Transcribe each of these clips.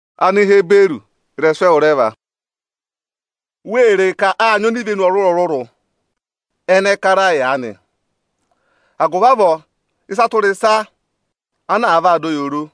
Ohomorihi óo sì ịrẹyị ayị; agụvị avọọ ọọ̄ sị ụyaa rị yị nị. Wee re ka áa nyị onivenu ọrụrụ-ọrụrụ ana kara yị aanị. Agụvị avọọ ịsa tụra ịsa ana àa vaa dọ yị oro,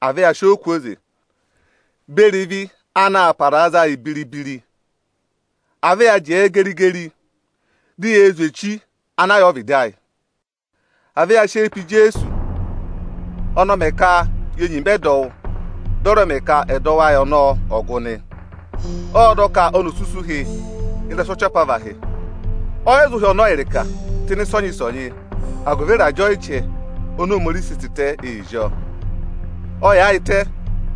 à vẹ ya sị ọọ kwooze beri ịvị anaā paraa za yị biri-biri! À vẹ ya jẹẹ geri-geri, di yee zwe echi ana yà ọvịdị ayị! À vẹ ya sị eyi pe Ijeesu! Ọnị ọ mẹ ka ye nyima ẹdọwụ, dị ọ rẹ mẹ ka ẹdọwụ ayị ọnọọ ọ̀ gụ nị. Ộ dọ ka oni ò sú isu ụhị ị́rẹsụ ọchị apavahị. Ọ yị za ụhị ọnọọ ịrịka tụ́ ịnị ịsọnyị-ịsọnyị agụvị ịrajẹ ọyịjẹ oni Ohomorihi sị tịtẹ ee zí ọọ. Ọ yaayịtẹ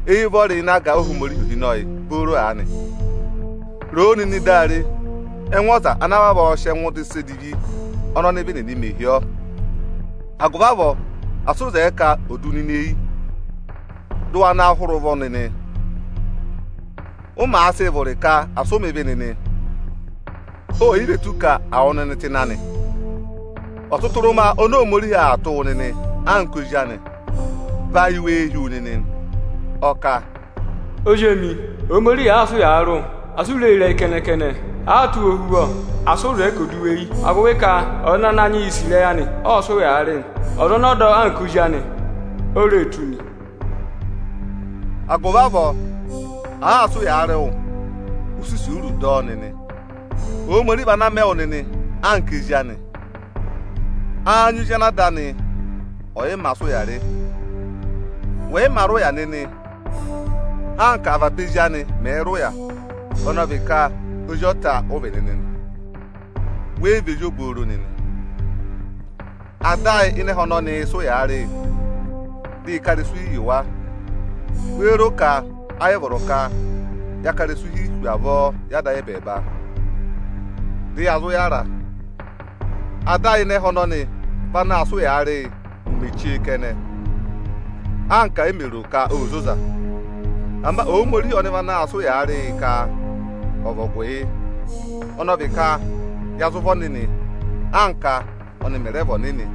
éyi ụvọrị ịnị aga Ohomorihi ohinọyị booro aanị. Roo nịnị dị a re ẹngụ ọza ana vavọọ sị ẹngụ dọ ịsa edivi ọnị ọnịvị nịnị mẹ hi ọ! Agụvị avọọ asị ụ zẹẹ ka ò du wu nịnị eyi, dị ụ wa na hụrẹ ụvọ nịnị! Ụ màa sịị vụrị ka asị ụ mẹ̀ ịvị nịnị, oò yi ve tù ka à wụ̀ wụ nịnị tụ́ ịnị anị. Ọtụtụrụma oni Ohomorihi aa tụ́ wụ nịnị anka ozi anị, vị ayị wéé hí wu nịnị nị? Ọ kà, “Ozi emi, Ohomorihi ọ̀ọọ tụ wụ ohuvọ, asị ụ sị eyi wụ̀ ịrẹyị anị. Àaa sị́ ụyaa rị wụ, asị ụ zẹẹ ka ò du wu eyi. Agụvị ka ọza ana Ananyị yị sì ịrẹyị anị, ọọ̄ sị ụyaa rị nị; ọza ọnị ọ̀ọ dọ anka ozi anị, o ree tụ́ nị.” Agụvị avọọ, àaa sị ụyaa rị wụ, ụ sị isuuru dọ ọ nịnị! Ohomorihi vị ana aa mẹ wụ nịnị anka ezi anị. Áá nyị ozi ana ada anị ọ̀yị mā sị ụya rị? Wẹ̀ yị mā rị ụya nịnị, anka avaba ezi anị mẹ̀ẹ̄ rị ụya, ọnị ọ vị ka ozi ọta ụ vị nịnị nị, wẹ yị vị ezi obooro nịnị. Ada ayị ịnị ẹhẹ ọnọnịị̄ sị ụyaa rị yị, dị ị ká ịrẹsụ hi yị wa. Wéé ro ka ayị vọrọ ka ya ká ịrẹsụ hi hu avọọ yị Ada ayị ẹbẹẹba, dị ya zụ yára? Ada ayị ịnị ẹhẹ ọnọnị vị ana aa sị ụyaa rị yị mẹ ụmẹ chee kẹnẹ, anka e mè ro ka óo zoza. Ama Ohomorihi ọnị vị anaā sịị ụyaa rị yị ka ọ̀ vị ọgụ yị; ọnị ọ vị ka ya zụ vị ọnịnị, anka ọ́nị mẹ̀ rẹ vị ọnịnị.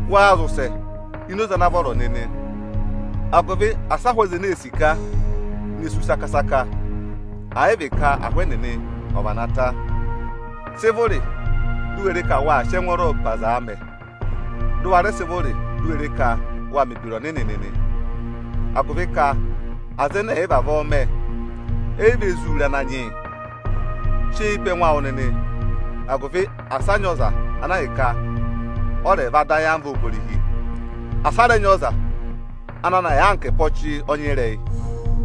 Waa zị ụsẹ ini oze ana vọrọ nịnị! agụvị asị ahụ aza ene ee sika, ne sú saka-saka, àyị vị ka ahụ ẹnịnị ọ̀ vana ta! Sị vụrị, di u we re ka wáa sị ẹngwọọrọ pe aza aa mẹ; dị ụ wa rẹ sị vụrị di u we re ka waa mẹ̀ ebira ọnịnị nịnị! Agụvị ka aza ẹnẹ ẹ̀yị vavọọ mẹ, eyi ve zuu re Ananyị yị. Sị eyi pe ẹngụ awụ nịnị, agụvị asị a nyị ọza ana ahịka ọ rẹ̀ vaa dọ ayamva Ohomorihi! Asị a rẹ nyị ọza ana na yà anka ẹpa ọchị ọnyịrẹyị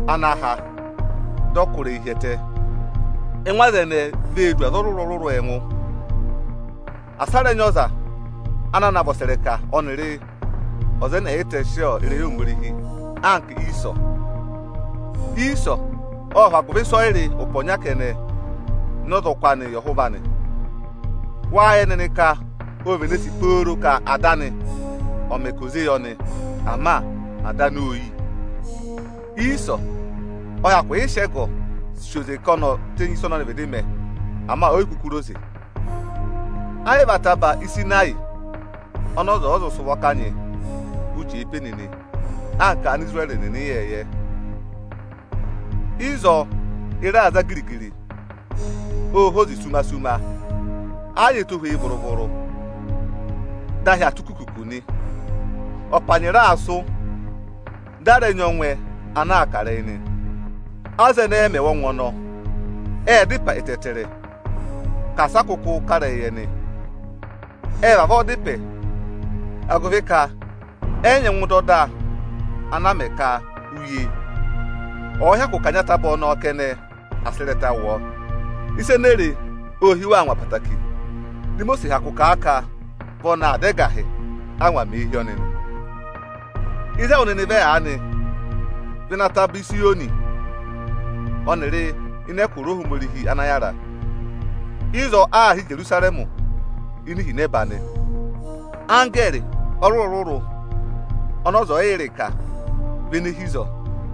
ana ha dị ọ̀ọ kụ́ ịrẹyịị hi ẹtẹ! Ẹngụ aza ẹnẹẹ vee du aza ọrụrụ-ọrụrụ ẹngụ. Asị a rẹ nyị ọza ana na vị ọsẹrẹka ọnịrị ọza ẹnẹ ẹ̀ yị tẹsị ịrẹyị Ohomorihi anka Iisọ! Iisọ ọ́ọ hụ agụvị ịsọyịrị ụpẹ ọnya kẹnẹ ná ọzọkụ anị yị ọhụva anị. Wáa yẹ nịnị ka ô vene sì pooro ka ada anị ọ̀ mẹ ka ò zé yị ọnị, ama ada anị ô yi. Iisọ ộ hyakụ yị sị ẹgọ sì oze ka oni ò tenyi ịsa ọnị ọnị vịdị mẹ, ama o yi kuku re oze. Ẹ yị vị ataba (Ịsịnayị) ọnị ọza zụ sị ụvọ kanyị, ụ jẹẹ pe nịnị (anka Anisirẹrị nịnị ịyẹẹyẹ). Ịzọọ, ịra aa za giri-giri, ô hozi ruma-ruma, ẹ yị nyị ẹtohweyi vụrụ-vụrụ, dị ahị aa tụ́ kukuku nị. Ọpanyị raa sụ́, di a rẹ nyị ọngwẹ ana aa kà ịrẹyị nị. Aza ẹnẹẹ mẹ̀ wụ́ ọngwẹ ọnọọ, ệ da ịpẹ ẹtẹẹtẹrẹ ka asị ọ kụkụ kà ịrẹyị yị ẹnị. Ẹ́ẹ vavọọ dá ịpẹ, agụvị ka ẹ yị nyẹngụ dọ ọda ana a mẹ ka, uye ọ̀ọ hyakụ kanyị ataba ọnọọ kẹnẹ, à sị ịrẹta wụ ọọ. Ịsa ene e re ô hí wa angwa ẹtẹẹtẹrẹ. Di Imosiisi hyakụ kà a ka vị ọnị aa dá ẹgahị, ángwa mèe hí ọnị nị. Ịzị ẹwụ nịnị vẹ aanị vị ịnị Ataba Ịzayọnị, ọnịrị ịnị ẹkụra Ohomorihi ana yára. Ịzọọ aā hị́ Ijerusarẹmị ini ihinẹba nị. Anggẹẹrị ọrụrụ-ọrụrụ ọnị ọza ọ̀yị yẹ ịrịka vị ene hi ịzọọ.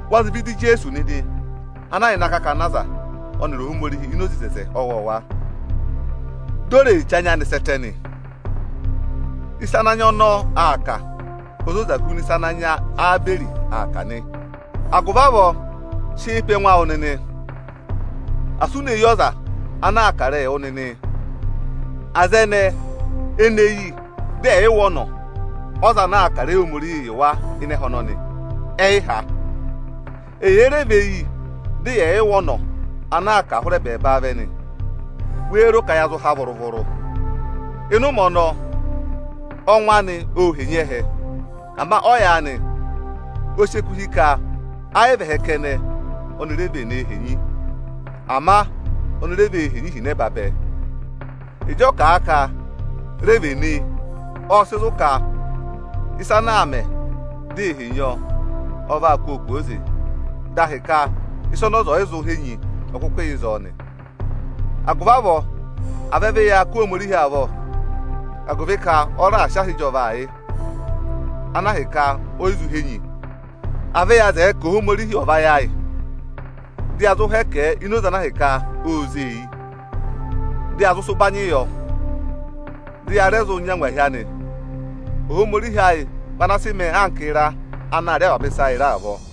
Wa zị vẹ ịdị Ijeesu nịnị, ana yà ịnị akakana aza ọnịrị Ohomorihi ini oze oto ọwọọwa, dị o re che anya anị sẹ́ ẹtẹ nị. Ịsa ana anya ọnọọ aa kà, o zoza huna ịsa ana anya Ẹba aa kà nị. Agụvị avọọ, sị eyi pe ẹngụ awụ nịnị, asị u ne yi ọza ana aa kà ịrẹyịị wụ nịnị! Aza ẹnẹẹ ene yi dị ẹ̀yị wụ́ ọnọ ọza ana a kà ịrẹyị Ohomorihi yị wa ịnị ẹhẹ ọnọnị, ẹ yị há. Ẹyị èe re ve yi, dị yẹ̀ yị wụ́ ọnọ ana aa kà a hụrẹ ẹbẹẹba vẹ nị, wéé ro ka ya zụ há vụrụ-vụrụ? Ịnị ụmẹ ọnọọ, ọngwẹ anị ô henyi ẹhẹ. Ama ọyaanị, ọ sị eku hị́ ka ẹ yị vị ẹhẹ kẹnẹ oni re venee henyi, ama oni re vee henyi ihinẹba bẹẹ. Ịjị ọ kà a ka, “re venee”, ọ́ọ sị zụ̀ ka e vee henyi ịsa ana a mẹ, dị a kụ́ wa kwooze. Dị a hị́ ka ịsa ọnị ọza ò yi zụ henyi, ọ kụkụ yà ịzọọ nị. Agụvị avọọ, à vẹ vị yaa kụ́ Ohomorihi avọ, agụvị ka ọ raà sị aha ịjọvaa yị, ana ahịka o yi zụ henyi. À vẹ ya zẹẹ ka Ohomorihi ọ̀ vayị ayị, dị ya zụ hẹkẹ ẹ ini oze ana ahịka óo zé e eyi; dị ya zụụ sị ụbanyịị yọ, dị ya rẹ zụ nyị angwahi anị! Ohomorihi ayị vị ana sị mẹẹ anka ịra anaā rị avaba ịsa ịra avọọ.